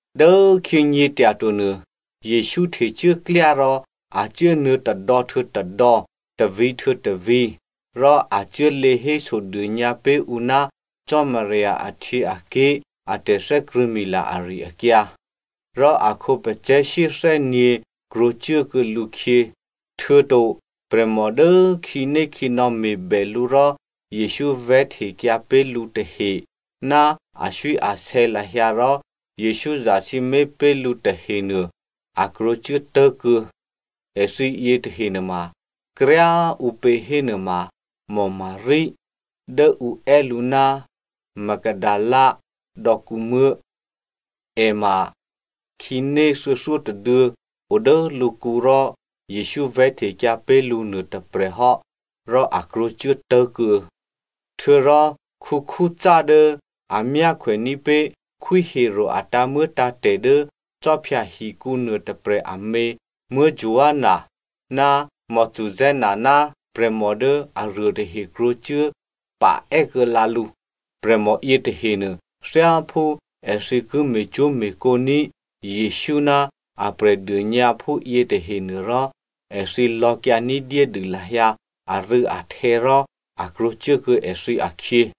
Dốkhyě nyě̤tyato nuô, Jesǔ htecuốklyá rò a cuốnuô̌ tôdò̌ htuô̌ tôdò̌, tôvǐ̤ htuô̌ tôvǐ̤, rò a cuốlě hésodônyǎ pé̤ ǔ ná Cò́marya ahtyěaké̤ a tè̤thè́krṳ̂̌mila ari-akyǎ. Rò a khǒpacè̤̌ shyéthè́nyě̤ krwǒcuốkuô̌ lǔkhyě. Htuô̌to prè̤mò dố khǐnékhǐnò̌ me̤bè lǔ rò Jesǔ vè̤́htekyǎ pé̤ lǔ tahe, ná aswíasè̌ lahyǎ rò Jesǔ zasǐmé̤ pé̤ lǔ tahenuô, a krwǒcuố tố̤kuô̌. Èthǐ yětahe nuôma kryá꤮ ǔpě hénuôma, Maria (Dố ǔ è́ lǔ ná Magdalena dò̌kǔmuố̤), è ma khǐné thuô̌thyótôduô̌ o dố lǔkǔ rò Jesǔ vè̤́htekyǎ pé̤ lǔ nuôtôprè̤ hò́ rò a krwǒcuố tố̤kuô̌. Htuô̌rò Chuza dố a myákhwèní̤ pé̤ Khwí Herodè a tǎ̤muô̌tǎ̤tè̤ dố khwí hǒkǔnuô tôprè̤ amě Joanna ná Susanna ná prè̤mò dố aruô tahe krwǒcuố pa è́kuô̌lǎ lǔ. Prè̤mò yětahenuô, thyáphú èthǐ ki me̤cwó̤me̤kǒ ní̤ Jesǔ ná a prè̤dônyǎphú yětahenuôrò, èthǐ lò̌kyǎ ní̤dyédû lahyǎ arû̌ahtè̌ rò a krwǒcuốkuô̌ èthǐ akhyě.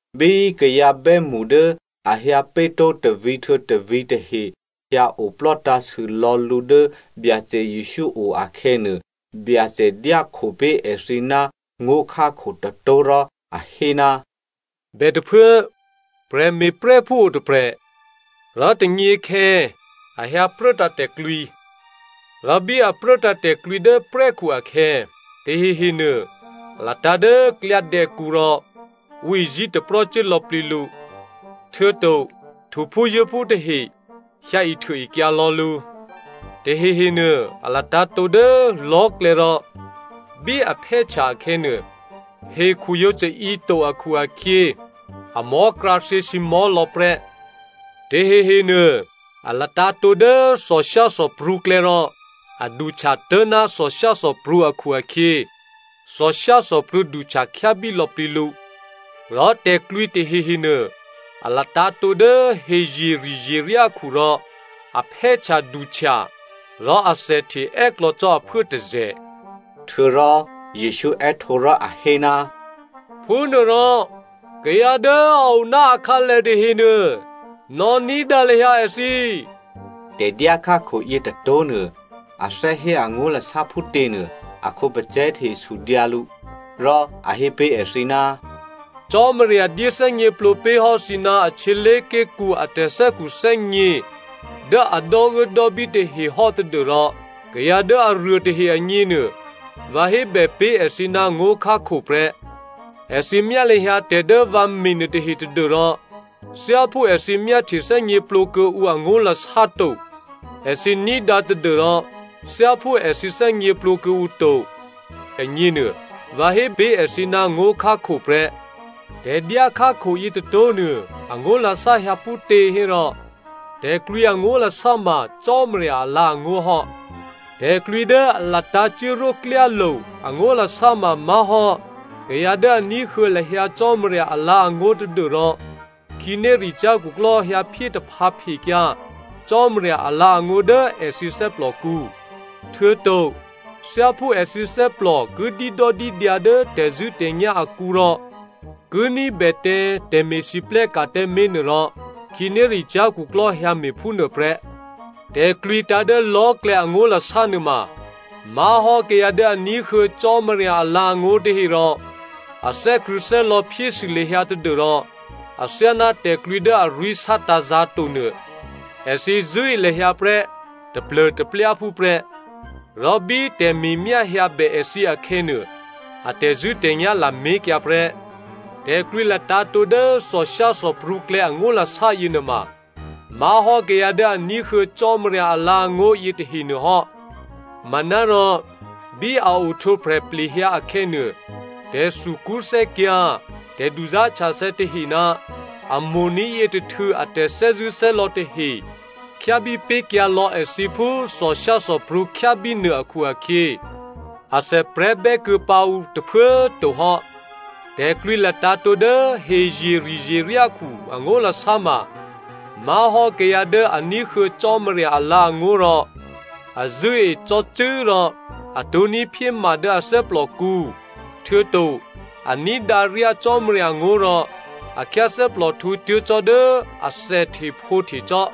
Bí kayǎ bè́mṳ dố a hyǎ pé̤tó̤ tôvǐ̤ htuô̌ tôvǐ̤ tahe hyǎoplò́ tǎ̤sûlò̌ lǔ dố Byacè Jesǔ o akhè̌nuô, Byacè dyákho pé̤ èthǐ ná ngó̤khákho tôtó̤ rò a hé, “Bètôphuố prè̤me̤prè́phú o tôprè̤. Rò tônyěkhè̌ a hyǎ pruốtǎ̤ tè̤klwǐ. Rò bí a pruốtǎ̤ tè̤klwǐ dố prè́khu akhè̌, tahehenuô a latǎ̤ dố klyádè̌kǔ, rò ǔ izí̤taprò́ cuố lò̌plǐ lǔ, htuô̌to htuphúzuố̤phú tahe hyǎihtuôekyǎ lò̌ lǔ. Tahehenuô a latǎ̤tǒ dố lò̤́klè̌ rò bí a phè́htya akhè̌nuô, hekhu yǒ caǐ to akhu-akhyě, amò̤́ krǎthyě sǐmò̤́lò̌ prè́. Tahehenuô, a latǎ̤tǒ dố thòshyáthòprǔklè̌ rò a duhtya tố̤ná thòshyáthòprǔ akhu-akhyě thòshyáthòprǔ duhtya khyábí lò̌plǐ lǔ. Rò tè̤klwǐ tahehenuô a latǎ̤tǒ dố hezyeri̤zyeryákhu rò a phè́htyaduhtya rò athèhte è́klò̌ cò́ aphuố tôzè̤.” Htuô̌rò Jesǔ è́htǒ rò a hé, “Phúnuôrò, kayǎ dố a o ná akhǎlè tahenuô, nò̌ ní̤dǎ lahyǎ èthǐ.” Tè̤dyá khákho yětôtó̤nuô a thè́ hé angó̤lasá phútěnuô, a khǒpacè̤̌ tahe sudyǎ lǔ. Rò a hé pé̤ èthǐ, “Cò́marya dyéthè́gněplǒ pé̤hò́ thǐ ná a htyělé̤ké̤kǔ a tè̤thè́khuthè́gně dố a dò́uốdò́bí tahe hò́ tadû́rò kayǎ dố aruô tahe agněnuô vǎ hébè pé̤ èthǐ ná ngó̤khákho prè́. ‘Èthǐ myá lahyǎ tè̤ dố vǎ me̤ nuôtahe tadû́rò thyáphú èthǐ myáhtye thè́gněplǒ kuô̌ǔ angó̤lasá to, èthǐ ní̤dǎ tadû́rò thyáphú èthǐ thè́gněplǒ kuô̌ǔ to,’” agněnuô, vǎ hé pé̤ èthǐ ná ngó̤khákho prè́. “Tè̤dyá khákho yětôtó̤nuô angó̤lasá hyǎ phútě hérò, tè̤klwǐ angó̤lasá ma Cò́marya alǎ̤angó̤ hò́. Tè̤klwǐ dố a latǎ̤ cuốrwó klyálo̤ angó̤lasá ma má̤hò́ kayǎ dố a ní̤huô̌ lahyǎ Cò́marya alǎ̤angó̤ tadû́rò khǐnéricyá̤ khuklò́ hyǎphyé taphǎphekyǎ Cò́marya alǎ̤angó̤ dố èthǐ thè́plòkǔ. Htuô̌to thyáphú èthǐ thè́plò ki dídòdídyǎ dố tè̤zṳ̂́tè̤nyá̤ akǔ rò ki ní̤bè tǎ tè̤me̤lwóhteka̤ tǎmé̤nuô rò khǐnéricyá̤ khuklò́ hyǎme̤ phúnuô prè́. Tè̤klwǐ tǎ̤ dố lò̤́klè̌ angó̤lasá nuôma má̤hò́ kayǎ dố a ní̤huô̌ Cò́marya alǎ̤angó̤ tahe rò a thè́krṳ̂̌thè́lò̌ phyésû lahyǎ tadû́rò athyáná tè̤klwǐ dố arwí̤ sátǎ̤zǎ̤to nuô. Èthǐ zṳ̂́e lahyǎ prè́ taplô̤taplyáphú prè́. Rò bí tè̤me̤myá hyǎbè èthǐ akhè̌nuô, a tè̤zṳ̂́tè̤nyá̤ lamé̤kyǎ prè́. Tè̤klwǐ latǎ̤tǒ dố thòshyáthòprǔklè̌ angó̤lasá yěnuôma má̤hò́ kayǎ dố a ní̤huô̌ Cò́marya alǎ̤angó̤ yětahenuô hò́. Manárò, bí a ohtwǒprè̤ plehyǎ akhè̌nuô, tè̤thukṳ́thè́kyǎ̤, tè̤duzá̤htyathè̌ tahe ná a mo̤ní̤ yětôhtû̌ a tè̤thè́zṳ̂́thè́lò̌ tahe khyábípé̤kyǎ lò̌ èthǐ phú thòshyáthòprǔ khyábí nuô akhu-akhyě athèprè̤́ bè́kuô̌ pǎ ǔ tôphuố꤮ to hò́. Tè̤klwǐ latǎ̤tǒ dố hezyeri̤zyeryákhu angó̤lasá ma má̤hò́ kayǎ dố a ní̤huô̌ Cò́marya alǎ̤angó̤ rò a zṳ̂́e cò́cû́ rò a tǒ̤ní̤ phyéma dố a thè́plòkǔ, htuô̌to a ní̤dǎ ryá Cò́marya ngó̤ rò a khyáthè́plòhtǔ tuố̤ cò́ dố athèhtephǒhtecò́.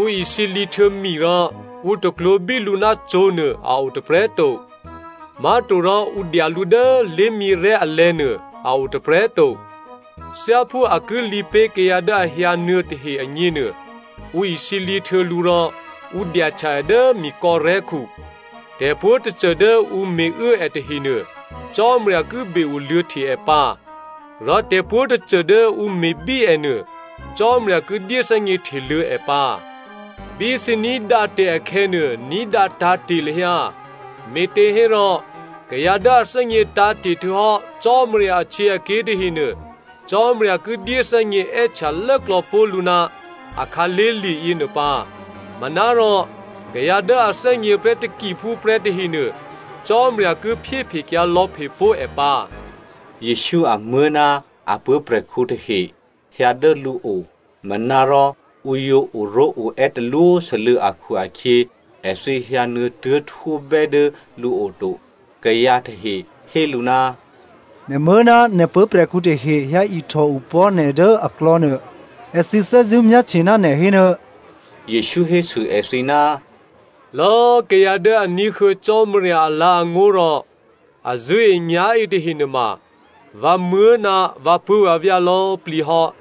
“Ǔ isǐlǐ htuô̌ mi rò ǔ taklwǒ̤bí lǔ ná cǒ̤nuô a o tôprè̤꤮ to. Má̤torò ǔ dya lǔ dố lé̤myěrè̤́ alè̤̌nuô a o tôprè̤꤮ to. Thyáphú a ki lǐ pé̤ kayǎ dố a hyǎnuô̌ tahe agně nuô, ǔ isǐlǐ htuô̌ lǔ rò ǔ dyahtya è dố mikò̌rè̤́khu. Tè̤pwǒ̤꤮ tôcô dố ǔ me̤uố è tahenuô, Cò́marya ki be-oluô̌hte è pǎ. Rò tè̤pwǒ̤꤮ tôcô dố ǔ me̤bí ènuô, Cò́marya ki dyéthè́gně hteluô̌ è pǎ. Bí thǐ ní̤dǎ tè̤ akhè̌nuô, ní̤dǎ tǎ̤te̤ lahyǎ. Me̤těhérò kayǎ dố a thè́gně tǎ̤te̤ htuô̌hò́ Cò́marya ahtyěaké̤ tahenuô, Cò́marya ki dyéthè́gně è́htya lốklò̌pó̤ lǔ ná a khǎlé̤lye̤ yěnuô pǎ. Manárò kayǎ dố a thè́gně prè́ takiphúprè́ tahenuô, Cò́marya ki phyéphekyǎ lò̌phe pó̤ è pǎ.” Jesǔ amuố̤ ná a puố̤prè̤khǔ tahe hyǎ dố lǔo, manárò ǔ yǒ oró̤oè́ talwósû́lû̌ akhu-akhyě èthǐ hyǎnuô̌ tuố̤htwóbè́ dố lǔo to. Kayǎ tahe hé lǔ, “Nè̤muố̤ ná nè̤ puố̤prè̤khǔ tahe hyǎihtò opò̤́ nè̤ dố aklò̌nuô. Èthǐ thè́zṳ̂́ myáhtye ná nè̤ hénuô.” Jesǔ hésû èthǐ, “Lò̌꤮ kayǎ dố a ní̤huô̌ Cò́marya alǎ̤angó̤ rò a zṳ̂́enyá̤e tahe nuôma vǎmuố̤ ná vǎpuố̤vǎvyá̤ lò̌꤮ plǐ hò́.”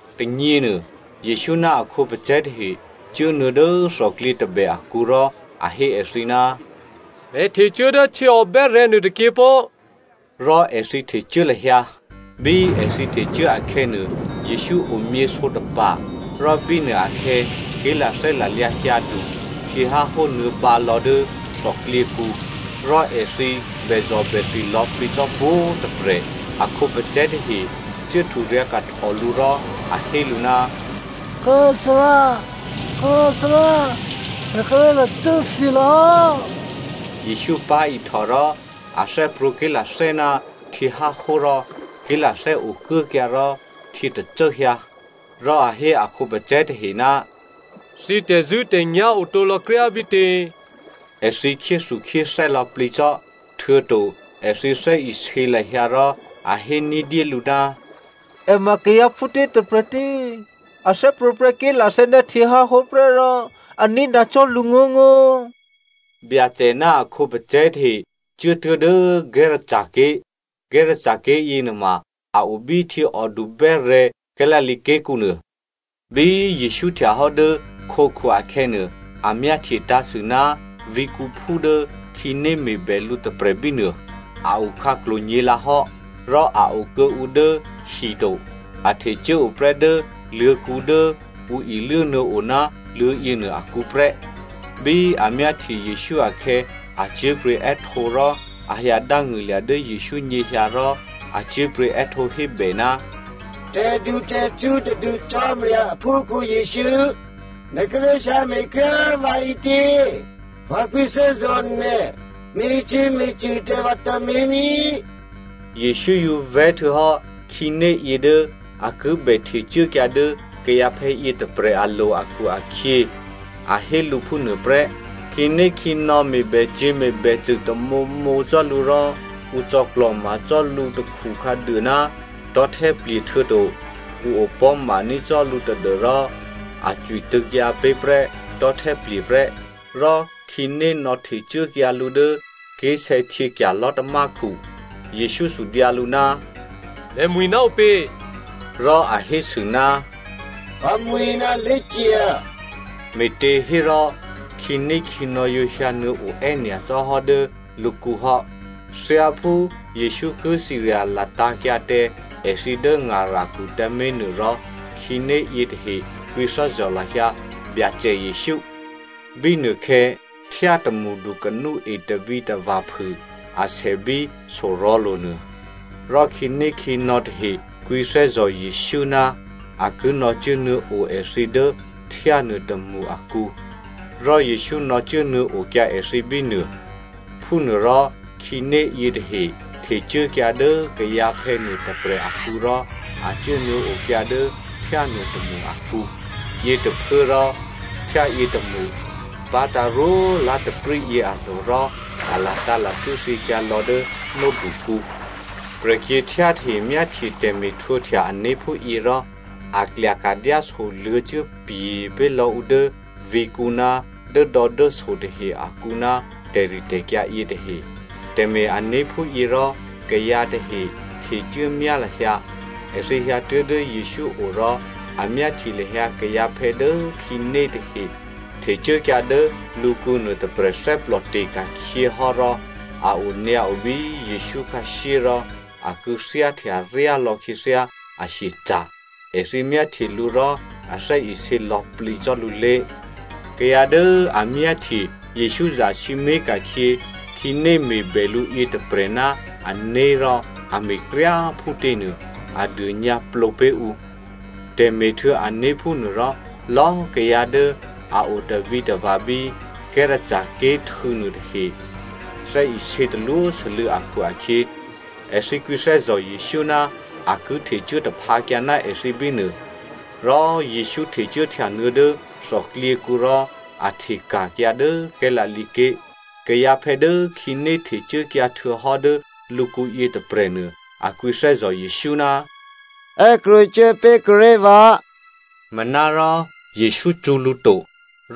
Tônyěnuô Jesǔ ná a khǒpacè̤̌ tahe cuốnuô̌ dố thòklyě tôbè akǔ rò a hé èthǐ, “Pè̤ htecuố dố htyěòbè́rè̤̌ nuôtôkyě pó꤮” rò èthǐ htecuố lahyǎ. Bí èthǐ htecuố akhè̌nuô, Jesǔ omyěsǒtapa̤, rò bínuô akhè̌, ké̤lathè́ lalyǎ hyǎdu, htyěháhó nuô̌bǎlò̌ dố thòklyěkǔ, rò èthǐ bèzò̤bèthi lò̌plǐ cò́ pwǒ̤꤮ tôprè̤. A khǒpacè̤̌ tahe cuố hturyǎ̤kahtò lǔ rò a hé lǔ, “Kố꤮ Thárá, Kố꤮ Thárá! Pè̤ kíré̤ lacû́thyě lò̌hò́!” Jesǔ pá̤ihtò rò a thè́prwǒ̤ ké̤lathè́ ná htyěháhó rò ké̤lathè́ okuốkyǎ rò htyětacố hyǎ. Rò a hé a khǒpacè̤̌ tahe, “Thǐ tè̤zṳ̂́tè̤nyá̤ otǒ lò̌kryá bítě?” Èthǐ khyéthukhyéthè́ lò̌plǐ cò́, htuô̌to èthǐ thè́isě lahyǎ rò a hé ní̤dyélǔ, “È ma kayǎ phútě tôprè̤tě? A thè́prwǒ̤prè́ ké̤lathè́ ná htyěháhó prè́ rò a ní̤dǎ cò́ lǔ ngó̤ngó̤꤮.” Byacè ná a khǒpacè̤̌ tahe cuốtuố̤ dố Gerasene ké̤. Gerasene ké̤ yěnuôma a o bí htyěòdu bè́rè̤̌ Galilea ké̤kǔnuô. Bí Jesǔ htyahò́ dố khǒkhu akhè̌nuô, a myáhtye tǎ̤sû ná vǐ̤kǔphú dố khǐné me̤bè lǔ tôprè̤ bínuô. A okhǎklo̤ nyě̤lǎhò́, rò a okuô̌ǔ dố hi to, a htecuố o prè́ dố luô̤̌kǔ dố ǔ iluố nuô̌o ná luô̤̌yěnuô akǔ prè́. Bí a myáhtye Jesǔ akhè̌, a cyé̤pryě̤ è́htǒ rò a hyǎ dángṳ̂lya̤ dố Jesǔ nyěhyǎ rò a cyé̤pryě̤ è́htǒhébè, “Tè̤dutè̤htǔ tadû Cò́marya aphúkhǔ Jesǔ, nè̤ kíré̤ hyǎme̤ kryá꤮ vǎ ǐtě? Vǎ kwǐthè́zò̤ nè̤, me̤cyě̤me̤cṳ̂ tǎ vǎ tǎmé̤ ní꤮.” Jesǔ yǒ vè̤́ htuô̌hò́ khǐné yě dố a ki bè htecuốkyǎ dố kayǎphè̌ yětôprè̤ alo̤ akhu-akhyě, a hé lǔ phúnuôprè́. Khǐnékhǐnò̌ me̤bècyě̤ me̤bècṳ̂ tamǒmǒ cò́ lǔ rò ǔ cò̌klò̤ma cò́ lǔtakhu khǎduô ná tò̤́htè́plye̤ htuô̌to ǔ opò̤́maní̤ cò́ lǔ tadû́rò a cwi tṳ̂̌kyǎ pé̤ prè́ tò̤́htè́plye̤ prè́. Rò khǐné nò̌htecuốkyǎ lǔ dố ké̤sè̌htyěkya̤ lò̤́tamákhu. Jesǔ sudyǎ lǔ, “Nè̤mwi̤ ná ǔpě?” Rò a hésû, “Vǎmwi̤ ná Legion,” me̤těhérò khǐnékhǐnò̌ yǒ hyǎ nuô̌o è́nyacò́ hò́ dố lǔkǔ hò́. Thyáphú Jesǔ ki cirya latǎ̤kyǎ tǎ èthǐ dố krò̌kǔdu krò̌kǔzǎ̤ tôkǔ tǎmé̤nuôrò, khǐné yětahe kwǐthè́zò̤ lahyǎ Byacè Jesǔ. Bínuôkhè̌, htyá tômṳdu kanúe tavǐtava̤phû asè bí sorò̤̌lo̤nuô. Rò khǐnékhǐnò̌ tahe kwǐthè́zò̤ Jesǔ ná a ki nò̌cuốnuô̌ o èthǐ dố htyá nuôtômṳ akǔ. Rò Jesǔ nò̌cuốnuô̌ okyǎ èthǐ bínuô. Phúnuôrò khǐné yětahe htecuốkyǎ dố kayǎphè̌ nuôtôprè̤ akǔ rò a cuốnuô̌okyǎ dố htyá nuôtômṳ akǔ. Yětôphuốrò htyá yětômṳ pá̤tǎ̤ rwó lá̤taprǐ yě alo̤ rò a latǎ̤lacû́ thyěkyǎ lò̌ dố nódukǔ. Prè̤kyě̤htyá tahe myáhtye tè̤me̤htwǒhtya ané̤ phúyě rò a klyaka̤ dyásoluô̌ cuốpye̤ pé̤lò̌ ǔ dố vǐ̤kǔ ná dốdò̌dốso tahe akǔ ná tè̤ritè̤kyǎ yětahe. Tè̤me̤-ané̤ phúyě rò kayǎ tahe htecuốmyá lahyǎ. Èthǐ hyǎtuố̤ dố Jesǔ o rò a myáhtye lahyǎ kayǎphè̌ dố khǐné tahe htecuốkyǎ dố lǔkǔ nuôtôprè̤ thè́plòte̤ ka̤khyě hò́ rò a onyǎo bí Jesǔ khǎshyé rò a kû̌thyáhtya ryá lò̌ khyěthyá ahyeca̤. Èthǐ myáhtye lǔ rò a thè́isě lò̌plǐ cò́ lǔlé̤. Kayǎ dố a myáhtye Jesǔ zasǐmé̤ ka̤khyě khǐné me̤bè lǔ yětôprè̤ ná ané̤ rò a me̤kryá꤮ phútěnuô, a dônyǎplǒ pé̤ ǔ. Tè̤me̤htuô̌ané̤ phúnuôrò, lò̌꤮ kayǎ dố a o tavǐtava̤ bí Gerasene ké̤ htû̌ nuôtahe thè́isě talwósû́lû̌ akhu-akhyě èthǐ kwǐthè́zò̤ Jesǔ ná a ki htecuố taphǎkyǎ ná èthǐ bínuô. Rò Jesǔ htecuốhtyanuô̌ dố thòklyěkǔ rò a hteka̤kyǎ dố Galilea ké̤. Kayǎphè̌ dố khǐné htecuốkyǎ htuô̌hò́ dố lǔkǔ yětôprè̤nuô a kwǐthè́zò̤ Jesǔ, “È́krwǒcuố pé̤kuô̌ré̤ vǎ,” manárò Jesǔ cṳ̌ lǔ to,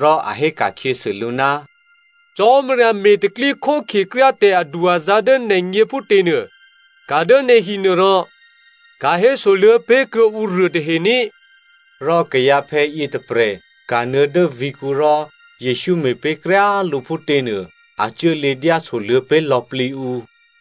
rò a hé ka̤khyěsû lǔ, “Cò́marya me̤ tè̤pro̤tè̤prya̤ kryá tè̤adu-azǎ̤ dố nè̤gně phútěnuô, ka̤ dố nè̤hi nuô rò ka̤hésoluô̌ pé̤ kuô̌ ǔruô tahe ní꤮.” Rò kayǎphè̌ yětôprè̤ kanuô̌ dố vǐ̤kǔ rò Jesǔ me̤ pé̤ kryá lǔ phútěnuô, a cuốlě dyásoluô̌ pé̤ lò̌plǐ ǔ.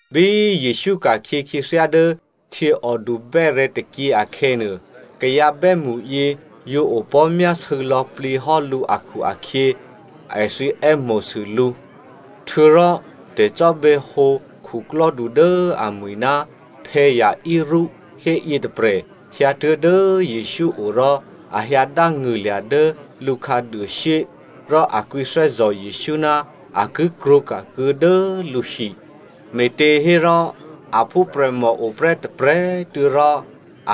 Bí Jesǔ ka̤khyě khyěthyá dố htyěòdu bè́rè̤̌ tôkyě akhè̌nuô, kayǎ bè́mṳyě yǒ opò̤́myásû̌ lò̌plǐ hò́ lǔ akhu-akhyě, èthǐ è́mo̤sû lǔ. Htuô̌rò tè̤cò́bè̌hǒ khuklò́du dố amwi̤ ná Jairus hé yětôprè̤ hyǎtuố̤ dố Jesǔ o rò a hyǎ dángṳ̂lya̤ dố lǔ khǎduôshyé, rò a kwǐthè́zò̤ Jesǔ ná a ki krwǒka̤kuô̌ dố lǔhi. Me̤těhérò a phúprè̤mò oprè́ tôprè̤꤮ tuô̌ rò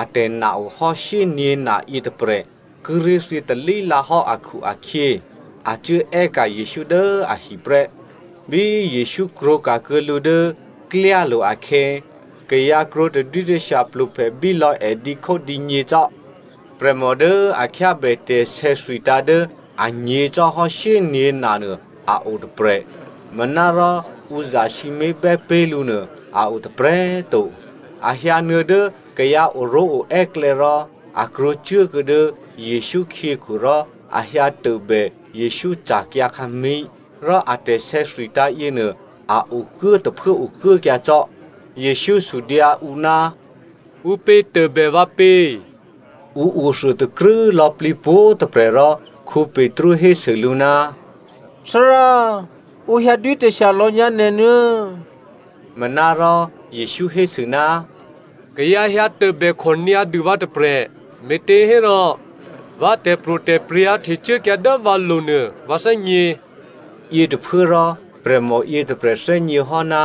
atè̤ na ohò́ shyényě̤na yětôprè̤ kíré̤ thyětalí lǎhò́ akhu-akhyě, a cuố è́ka̤ Jesǔ dố ahi prè́. Bí Jesǔ krwǒka̤kuô̌ lǔ dố klyálo̤ akhè̌, kayǎ krwǒ tadwítashya pluphèbílò̌ è dǐkhódǐnyě cò́. Prè̤mò dố a khyábè tè̤sè̌thwitǎ̤ dố anyě̤ cò́hò́ shyényě̤na nuô a o tôprè̤. Manárò ǔ zasǐmé̤bè́ pé̤ lǔnuô, a o tôprè̤꤮ to. A hyǎnuô̌ dố kayǎ oró̤oè́ klè̌ rò a krwǒcuốkuô̌ dố Jesǔ khyěkhu, rò a hyǎ tôbè Jesǔ ca̤kyǎkhǎmí̤, rò a tè̤sè̌thwitǎ̤ yěnuô a okuố tôphuố okuốkyǎ cò́. Jesǔ sudyǎ ǔ, “Ǔpě tôbè vǎ pě?” Ǔ othuôtakrû́ lò̌plǐ pwǒ̤꤮ tôprè̤ rò Petru hésû lǔ, “Thárá, ǔ hyǎdwítashya lò̌ nyǎ nè̤ nuô̌.” Manárò Jesǔ hésû, “Kayǎ hyǎtôbèkhò nyǎdû vǎ tôprè̤, me̤těhérò vǎ tè̤pro̤tè̤prya̤ htecuốkyǎ dố vǎlo̤ nuô vǎ thè́gně.” Yětôphuốrò prè̤mò yětôprè̤ thè́gněhò́ ná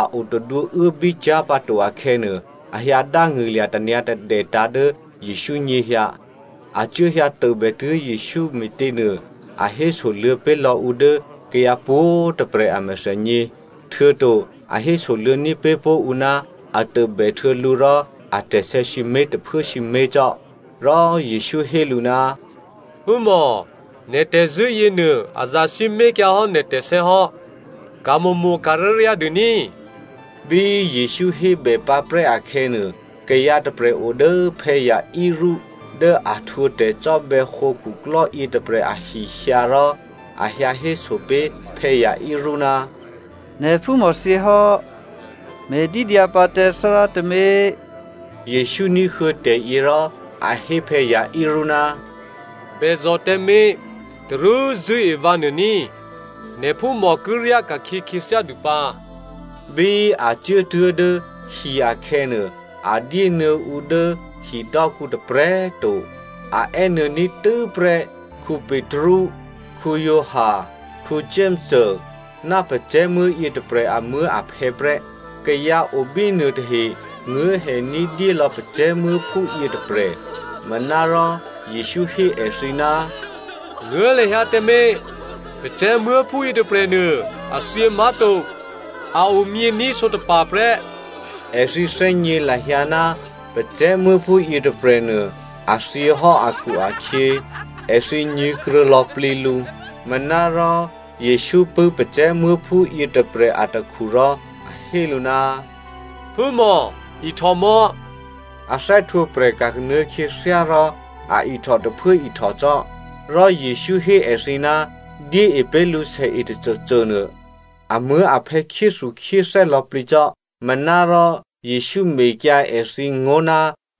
a o tadwǒuốbí cyá̤ pǎ to akhè̌nuô, a hyǎdángṳ̂lya̤ tanyǎ̤tadètǎ̤ dố Jesǔ nyěhyǎ. A cuốhyǎtôbè tuố̤ Jesǔ me̤těnuô, a hésoluô̌ pé̤lò̌ ǔ dố kayǎ pwǒ̤꤮ tôprè̤ a mèthènyě, htuô̌to a hésoluô̌ní̤ pé̤ pó̤ ǔ ná a tôbèhtuô̌ lǔ rò atè̤sè̌ sǐmé̤ tôphuố sǐmé̤ cò́. Rò Jesǔ hé lǔ, “Phúmò꤮, nè̤ tè̤zṳ̂́ yěnuô, a zasǐmé̤ kyǎhò́ nè̤ tè̤sè̌hò́, ka̤mo̤mo̤ ka̤ryáryá dûní꤮.” Bí Jesǔ hébèpǎprè́ akhè̌nuô, kayǎ tôprè̤ o dố Jairus dố a htwǒ tè̤cò́bè̌hǒ khuklò́ yětôprè̤ ahi hyǎ, rò a hyǎhéso pé̤ Jairus, “Nè̤phúmò thyěhò́, me̤dídyǎ pǎ tǎ Thárá tǎmé̤.” Jesǔ ní̤huô̌ tè̤yě rò a hé Jairus, “Bèzò̤ tǎmé̤, tarú zṳ̂́e vǎ nuô ní꤮, nè̤phúmò ki ryá ka̤khyě khyěthyá dû pǎ.” Bí a cuốtuố̤ dố hi akhè̌nuô, a dyénuô̌ ǔ dố hidò́kǔ tôprè̤꤮ to, a è́nuô̌ní̤ tû́prè́ Petru, Giovanni, Jakomo ná pacè̤̌muố̤ yětôprè̤ amuố̤aphè̌ prè́. Kayǎ o bínuô tahe nguố̤hè ní̤dyélò̌ pacè̤̌muố̤phú yětôprè̤. Manárò Jesǔ hé èthǐ, “Nguố̤ lahyǎ tǎmé̤. Pacè̤̌muố̤phú yětôprè̤nuô, a thyě má̤to, a omyění̤ sǒtapa̤ prè́!” Èthǐ thè́gně lahyǎ ná pacè̤̌muố̤phú yětôprè̤nuô a thyěhò́ akhu-akhyě, èthǐ nyě̤kruô̌ lò̌plǐ lǔ. Manárò Jesǔ pṳ̂́ pacè̤̌muố̤phú yětôprè̤ atakhu rò a hé lǔ, “Phúmò꤮ ihtò mò̌꤮!” A thè́htwǒprè̤ ka̤kanuô̌ khyěthyá rò a ihtò tôphuố ihtò cò́. Rò Jesǔ hé èthǐ ná dyée pé̤ lǔ sèe tôcôcô nuô. Amuố̤aphè̌ khyéthukhyéthè́ lò̌plǐ cò́, manárò Jesǔ mekyǎ èthǐ ngó̤ ná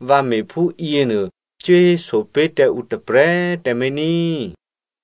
vǎ me̤ phúyě nuô cuố héso pé̤ tǎ ǔ tôprè̤꤮ tǎmé̤ ní꤮.